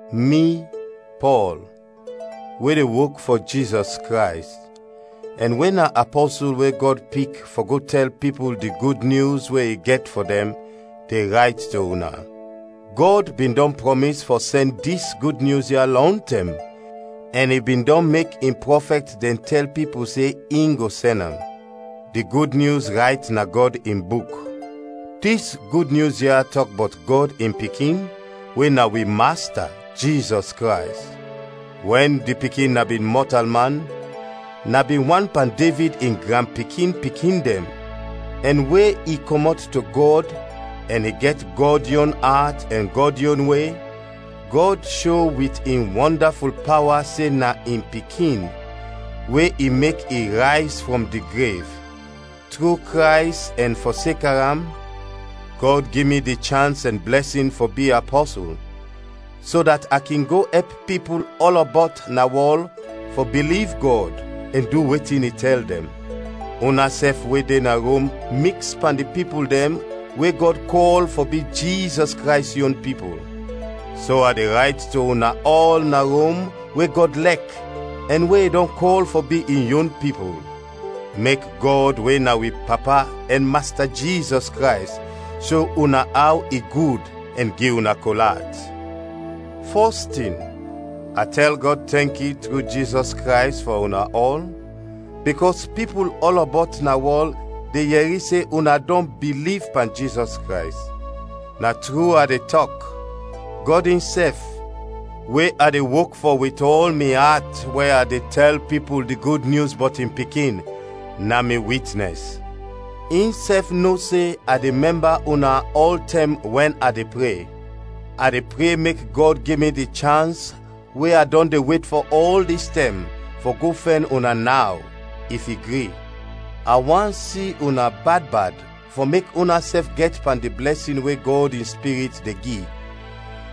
Mi, Pɔl, we de wok fɔ Jizɔs Krays, ɛn we na apɔsul we Gɔd pik fɔ go tɛl pipul di Gud Nyus we i gɛt fɔ dɛn, de rayt to una. Gɔd bin dɔn prɔmis fɔ sɛn dis Gud Nyus ya lɔntɛm ɛn i bin dɔn mek in prɔfɛt dɛn tɛl pipul se in go sɛn am; di Gud Nyus rayt na Gɔd in Buk. Dis Gud Nyus ya tɔk bɔt Gɔd in Pikin we na wi Masta Jizɔs Krays. Wɛn di Pikin na bin mɔtalman na bin wan pan Devid in granpikin-pikin dɛn; ɛn we i kɔmɔt to Gɔd ɛn i gɛt Gɔd yon at ɛn Gɔd yon we, Gɔd sho wit in wɔndaful pawa se na in Pikin, we i mek i rayz frɔm di grev. Tru Krays ɛn fɔseka am, Gɔd gi mi di chans ɛn blɛsin fɔ bi apɔsul, so dat a kin go ɛp pipul ɔlɔbɔt na wɔl fɔ biliv Gɔd ɛn du wetin i tɛl dɛn. Unasɛf we de na Rom miks pan di pipul dɛn we Gɔd kɔl fɔ bi Jizɔs Krays yon pipul. So a de rayt to una ɔl na Rom we Gɔd lɛk ɛn we i dɔn kɔl fɔ bi in yon pipul. Mek Gɔd we na wi Papa ɛn Masta Jizɔs Krays sho una aw i gud ɛn gi una kol at. Fɔs tin, a tɛl Gɔd tɛnki tru Jizɔs Krays fɔ una ɔl, bikɔs pipul ɔlɔbɔt na wɔl de yɛri se una dɔn biliv pan Jizɔs Krays. Na tru a de tɔk, Gɔd insɛf, we a de wok fɔ wit ɔl mi at we a de tɛl pipul di Gud Nyus bɔt in Pikin, na mi witnɛs. Insɛf no se a de mɛmba una ɔltɛm wɛn a de pre. A de pre mek Gɔd gi mi di chans we a dɔn de wet fɔ ɔl dis tɛm fɔ go fɛn una naw, if i gri. A want si una bad bad fɔ mek unasɛf gɛt pan di blɛsin we Gɔd in Spirit de gi,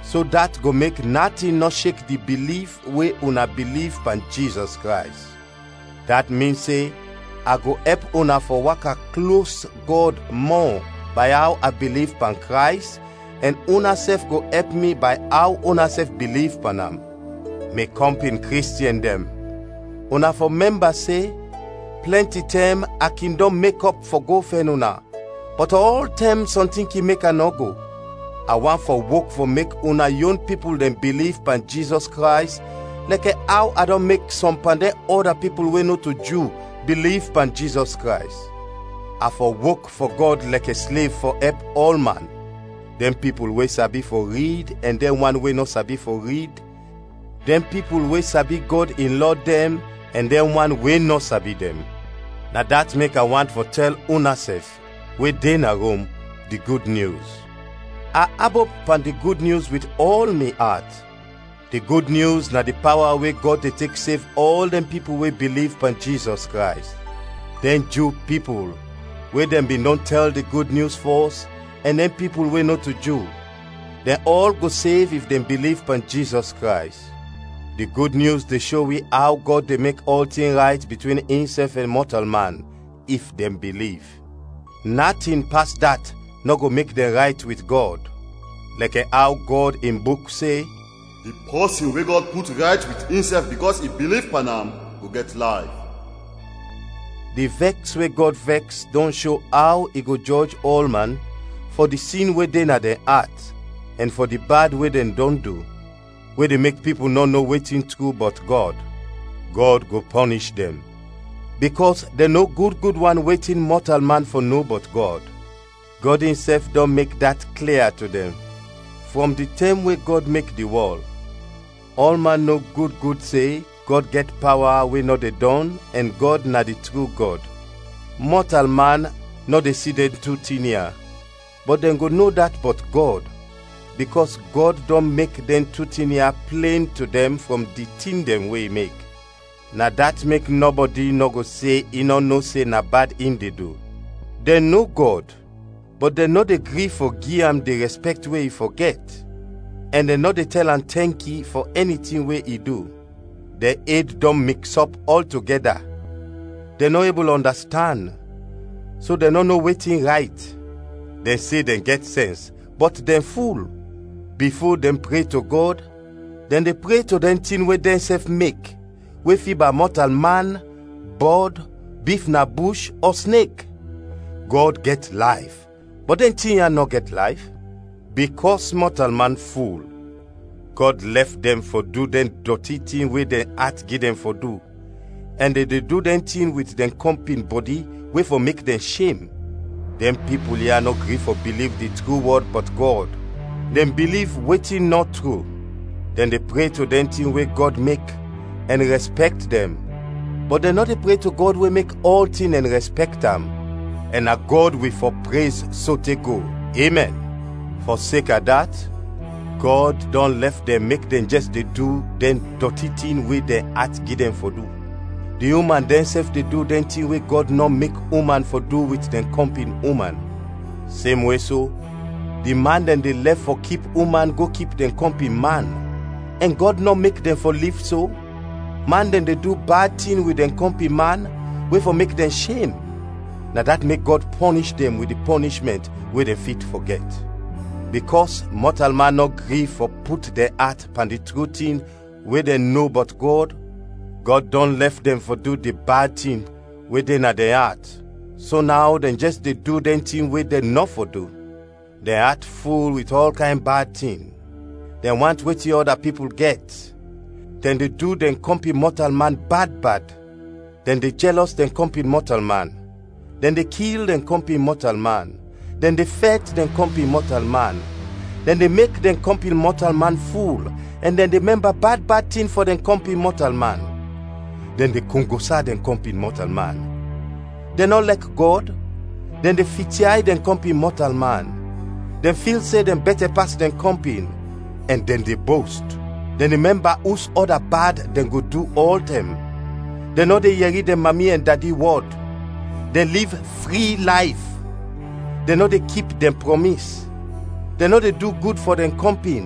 so dat go mek natin nɔ shek di biliv we una biliv pan Jizɔs Krays. Dat min se a go ɛp una fɔ waka klos Gɔd mɔ bay aw a biliv pan Krays ɛn unasɛf go ɛp mi bay aw unasɛf biliv pan am. Mi kɔmpin Kristiɛn dɛn, una fɔ mɛmba se, plɛnti tɛm a kin dɔn mekɔp fɔ go fɛn una, bɔt ɔltɛm sɔntin kin mek a nɔ go. A want fɔ wok fɔ mek una yon pipul dɛn biliv pan Jizɔs Krays lɛkɛ aw a dɔn mek sɔm pan dɛn ɔda pipul we nɔto Ju biliv pan Jizɔs Krays. A fɔ wok fɔ Gɔd lɛkɛ slev fɔ ɛp ɔlman: dɛn pipul we sabi fɔ rid ɛn dɛn wan we nɔ sabi fɔ rid, dɛn pipul we sabi Gɔd in lɔ dɛn ɛn dɛn wan we nɔ sabi dɛn. Na dat mek a want fɔ tɛl unasɛf, we de na Rom, di Gud Nyus. A abop pan di Gud Nyus wit ɔl mi at. Di Gud Nyus na di pawa we Gɔd de tek sev ɔl dɛn pipul we biliv pan Jizɔs Krays. Dɛn Ju pipul we dɛn bin dɔn tɛl di Gud Nyus fɔs ɛn dɛn pipul we nɔto Ju, dɛn ɔl go sev if dɛn biliv pan Jizɔs Krays. Di Gud Nyus de sho wi aw Gɔd de mek ɔltin rayt bitwin insɛf ɛn mɔtalman, if dɛn biliv; natin pas dat nɔ go mek dɛn rayt wit Gɔd. Lɛkɛ aw Gɔd in Buk se, “Di pɔsin we Gɔd put rayt wit insɛf bikɔs i biliv pan am go gɛt layf.” Di vɛks we Gɔd vɛks dɔn sho aw i go jɔj ɔlman fɔ di sin we de na dɛn at ɛn fɔ di bad we dɛn du, we de mek pipul nɔ no wetin tru bɔt Gɔd. Gɔd go pɔnish dɛn, bikɔs dɛn no gud gud wan wetin mɔtalman fɔ no bɔt Gɔd. Gɔd insɛf dɔn mek dat klia to dɛn. Frɔm di tɛm we Gɔd mek di wɔl, ɔlman no gud gud se Gɔd gɛt pawa we nɔ de dɔn ɛn Gɔd na di tru Gɔd. Mɔtalman nɔ de si dɛn tu tin ya, bɔt dɛn go no dat bɔt Gɔd, bikɔs Gɔd dɔn mek dɛn tu tin ya plen to dɛn frɔm di tin dɛn we i mek. Na dat mek nɔbɔdi nɔ go se in nɔ no se na bad in de du. Dɛn no Gɔd, bɔt dɛn nɔ de gri fɔ gi am di rɛspɛkt we i fɔ gɛt, ɛn dɛn nɔ de tɛl am tɛnki fɔ ɛni tin we i du. Dɛn ed dɔn miks ɔp ɔltogɛda, dɛn nɔ ebul ɔndastand, so dɛn nɔ no wetin rayt. Dɛn se dɛn gɛt sɛns, bɔt dɛn ful. Bifo dɛn pre to Gɔd, dɛn de pre to dɛn tin we dɛnsɛf mek we fiba mɔtalman, bɔd, bif na bush, ɔ snek. Gɔd gɛt layf, bɔt dɛn tin ya nɔ gɛt layf. Bikɔs mɔtalman ful, Gɔd lɛf dɛn fɔ du dɛn dɔti tin we dɛn at gi dɛn fɔ du, ɛn dɛn de du dɛn tin wit dɛn kɔmpin bɔdi we fɔ mek dɛn shem. Dɛn pipul ya nɔ gri fɔ biliv di tru wɔd bɔt Gɔd, dɛn biliv wetin nɔ tru; dɛn de pre to dɛn tin we Gɔd mek ɛn rɛspɛkt dɛn, bɔt dɛn nɔ de pre to Gɔd we mek ɔltin ɛn rɛspɛkt am, ɛn na Gɔd wi fɔ prez sote go! Emɛn. Fɔseka dat, Gɔd dɔn lɛf dɛn mek dɛn jɛs de du dɛn dɔti tin we dɛn at gi dɛn fɔ du. Di uman dɛnsɛf de du dɛn tin we Gɔd nɔ mek uman fɔ du wit dɛn kɔmpin uman. Semwe so, di man dɛn de lɛf fɔ kip uman go kip dɛn kɔmpin man, ɛn Gɔd nɔ mek dɛn fɔ liv so. Man dɛn de du bad tin wit dɛn kɔmpin man we fɔ mek dɛn shem, na dat mek Gɔd pɔnish dɛn wit di pɔnishmɛnt we dɛn fit fɔ gɛt. Bikɔs mɔtalman nɔ gri fɔ put dɛn at pan di tru tin we dɛn no bɔt Gɔd, Gɔd dɔn lɛf dɛn fɔ du di bad tin we de na dɛn at, so naw dɛn jɛs de du dɛn tin we dɛn nɔ fɔ du. Dɛn at ful wit ɔl kayn bad tin: dɛn want wetin ɔda pipul gɛt, dɛn de du dɛn kɔmpin mɔtalman bad bad, dɛn de jɛlɔs dɛn kɔmpin mɔtalman, dɛn de kil dɛn kɔmpin mɔtalman, dɛn de fɛt dɛn kɔmpin mɔtalman, dɛn de mek dɛn kɔmpin mɔtalman ful, ɛn dɛn de mɛmba bad bad tin fɔ dɛn kɔmpin mɔtalman. Dɛn de kongosa dɛn kɔmpin mɔtalman, dɛn nɔ lɛk Gɔd, dɛn de fityay dɛn kɔmpin mɔtalman, dɛn fil se dɛn bɛtɛ pas dɛn kɔmpin, ɛn dɛn de bost; dɛn de mɛmba us ɔda bad dɛn go du ɔltɛm; dɛn nɔ de yɛri dɛn mami ɛn dadi wɔd; dɛn liv fri layf; dɛn nɔ de kip dɛn prɔmis; dɛn nɔ de du gud fɔ dɛn kɔmpin,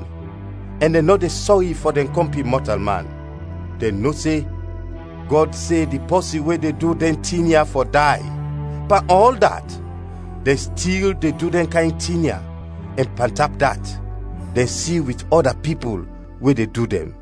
ɛn dɛn nɔ de sɔri fɔ dɛn kɔmpin mɔtalman. Dɛn no se Gɔd se di pɔsin we de du dɛn tin ya fɔ day. Pan ɔl dat, dɛn stil de du dɛn kayn tin ya, ɛn pantap dat, dɛn si wit ɔda pipul we de du dɛn.